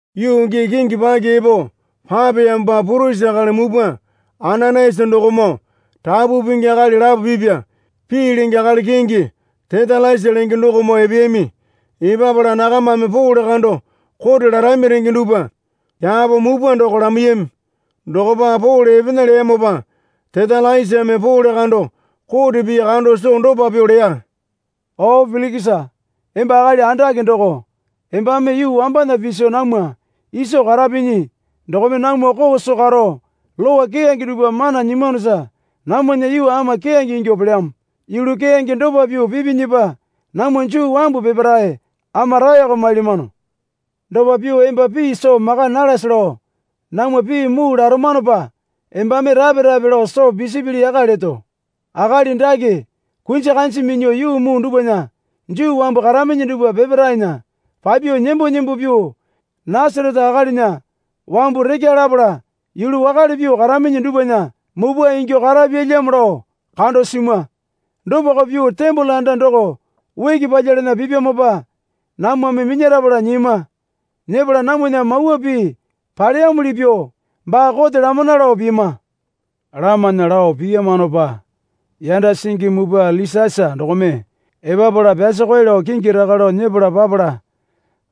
Yuu gii kingi paki epo papeyamopa purisi akali mupwa Ananayasa dokomoo rapu pingi akali lapo pipya pii lenge akali kingi Tetalasa lenge dokomoo epeyami. Epapala nakamame Pole kando kote larami renge dupwa kyapo mupwa doko lamaiyami. Dokopa Pole epena leyamopa Tetalasame Pole kando kote pii kando soo dopa pyuo leya. O Pilikisa emba akali andake doko. Embame yuu wambana piso namwa iso karapinyi dokome namwa koo soo karo lowa keyange dupwa mana nyimwanosa namwana yuu ama keyange ingyuo pelyamo. Yulu keyange dopa pyuo pipinyipa namwa Juu wambu peparae ama raeko mailyamano. Dopa pyuo emba pii soo maka nalase lao namwa pii muu laramanopa embame rape rape lao soo pisipili yaka leto. Akali dake kunji kanji minyuo yuu muu dupwana Juu wambu karaminyi dupwa peparaena papyuo nembo nembo pyuo Nasarete akalinya wambu rekya lapala yulu wakale pyuo karaminyi dupwana mupwa inyuo karapyalyamo lao kando simwa. Dopako pyuo tembole anda doko uki palyalana pipyamopa namwame minyarapala nyiyama. Nyepala namwana Mawa Pii paleyamuli pyuo baa kote lamana lao piyama. Lamana lao piyamanopa yanda singi mupwa Lisiasa dokome epapala pyasokoe lao kingi rekya lao nyepala papala,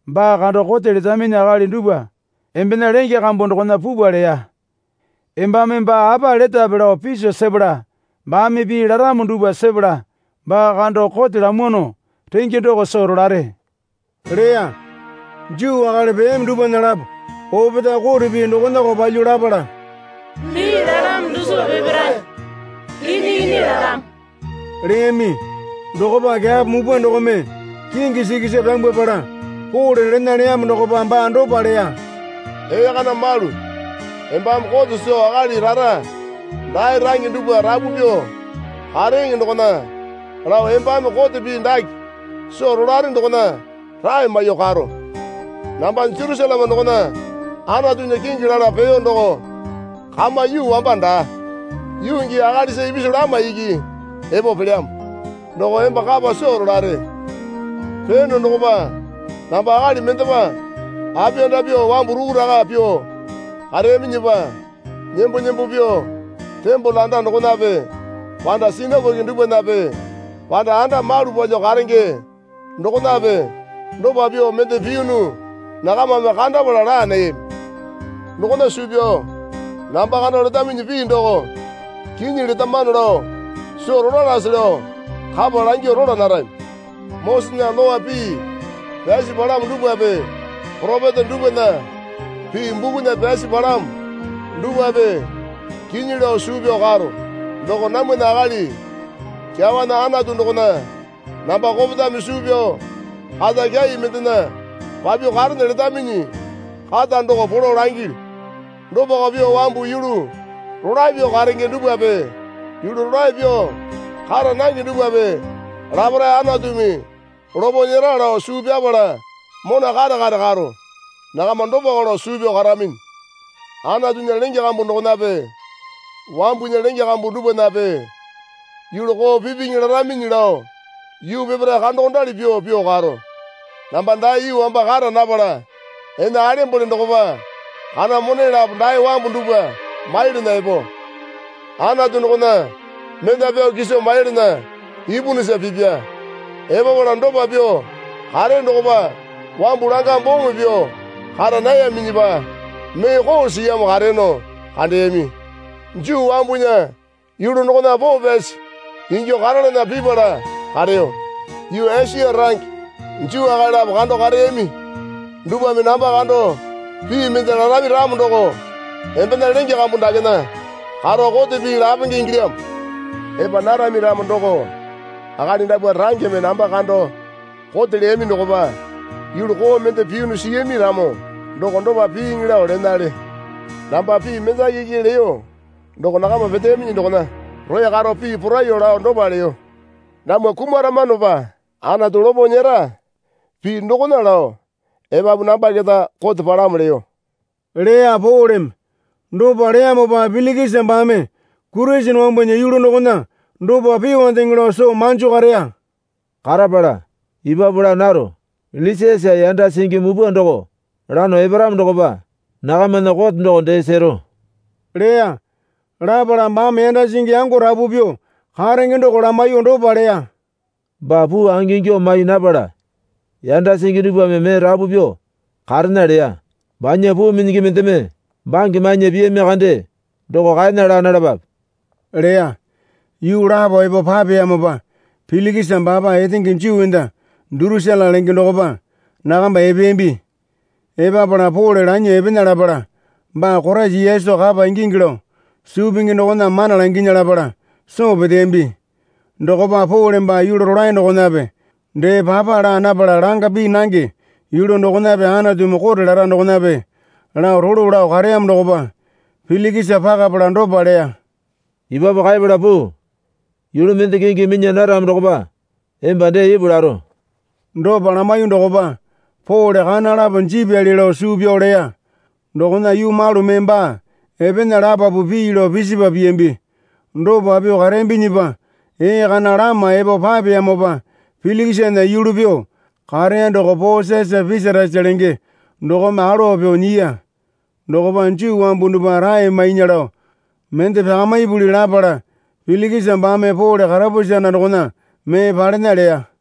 baa kando kote letaminyi akali dupwa embena lenge kambu dokona pupwa leya. Embame baa apa letape lao piso sepala baame pii laramo dupwa sepala baa kando kote lamwano renge doko soo rolare leya. Juu akali peyami dupwana lapo opetae kote pii dokonako palyuo lapala, Pii lalamo dusipa peparae kinyi kinyi lalamo leyami. Dokopa kyapo mupwa dokome kingi sikisa pyambwapala Pole lena leyamo dokopa baa dopa leya. Ee kana malu embame kote soo akali rara dae range dupwa rapu pyuo kareeŋe dokona lao embame kote pii dake soo rolare dokona rae maiyuo karo. Namba Jerusaleme dokona Anatunya kingi lala peyo doko kama yuu wamba daa, yuu gii akalisa ipisu lama iki epo pelyamo. Doko emba kapa soo rolare. Peyono dokopa namba akali mendepa apiyanda pyuo wambu rukuraka pyuo kareyaminyipa nembo nembo pyuo tembole anda dokonape panda sinakoke dupwanape panda anda malu palyuo karenge dokonape dopa pyuo mende piyunu nakamame kandapala laa nayami. Dokona suu pyao namba kando letaminyi pii doko kinyi letamano lao soo rolalase lao kapa langyuo rola narami. Mosesena Lowa pii pyasi palamo dupwape poropeta dupwana pii bukunya pyasi palamo dupwape kinyi lao suu pyao karo. Doko namwana akali kyawana Anatu dokona namba kopetame suu pyao kata kyai mendena papyuo karene letaminyi kata doko polo langilyu. Dopako pyuo wambu yulu rolae pyuo karenge dupwape yulu rolae pyuo kara nange dupwape laparae Anatumi lopo nyera lao suu pyapala mona kare kare karo. Nakama dopako lao suu pyao karaminyi. Anatunya lenge kambu dokonape wambunya lenge kambu dupwanape yulu koo pipiŋi laraminyi lao yuu peparae kandokondali pyuo pyuo karo. Namba dae yuu wamba kara napala ene alembole dokopa kana mone lapo dae wambu dupwa maiyalana epo, Anatu dokona mena pyao kiso maiyalana ipunusa pipya. Epapala dopa pyuo kareyo dokopa wambu langa bome pyuo kara nayaminyipa mee koo siyamo kareyono kandeyami. Juu wambunya yulu dokona poo pyasi ingyuo karalana pipala kareyo. Yuu Esia range Juu akali lapo kando kareyami. Dupwame namba kando pii mende larami ramo doko embena lenge kambu dakena karo kote pii lapenge ingilyamo. Epa narami ramo doko akali dapwa rangeme namba kando kote leyami dokopa yulu koo mende piyunu siyami ramo doko dopa piiŋi lao lenale. Namba pii mendaki iki leyo doko nakama peteyaminyi dokona roya karo pii poraiyuo lao dopa leyo. Namwa kumaramanopa Aantu lopo nyera pii dokona lao epapu namba keta kote palamo leyo, leya Poleme. Dopa leyamopa Pilikisa baame Kurisene wambunya yulu dokona dopa pyuondeŋe lao soo manjo kareya. Karapala, Epapu laa naro. Lisiasa yanda singi mupwa doko lano eparamo dokopa nakamana kote doko dee sero leya. Lapala baame yanda singi yango rapu pyuo karenge doko lamaiyuo dopa leya. Baa puu angingyuo mai napala yanda singi dupwame mee rapu pyuo karena leya. Banya puu minyingi mendeme bange mainya piyami kande doko kaena laa nalapape leya. Yuu lapo epo papeyamopa Pilikisa baapa etenge Juu enda Durusila lenge dokopa nakamba epeyambi. Epapala Pole lanyuo epena lapala baa Koraisa Yesu kapa ingingi lao suu pingi dokona mana langinya lapala soo peteyambi. Dokopa Pole baa yulu rolae dokonape dee papa lapala langa pii nange yulu dokonape Anatumi kote lara dokonape lao rolo lao kareyamo dokopa Pilikisa pakapala dopa leya. Epapu kaepala puu. Yulu mende kingi minya naramo dokopa emba dee ipu laro. Dopa lamaiyuo dokopa Pole kana lapo jipyali lao suu pyao leya. Dokona yuu malu mee baa epena lapapu pii lao pisipa piyambi. Dopa pyuo kareyambinyipa ee kana lama epo papeyamopa Pilikisana yulu pyuo kareya doko Posiasa Pesatasa lenge dokome alowa pyuo nyiya. Dokopa Juu wambu dupwa rae mainya lao mende pyakamipuli lapala Pilikisa baame Pole karapusi anda dokona mee palena leya.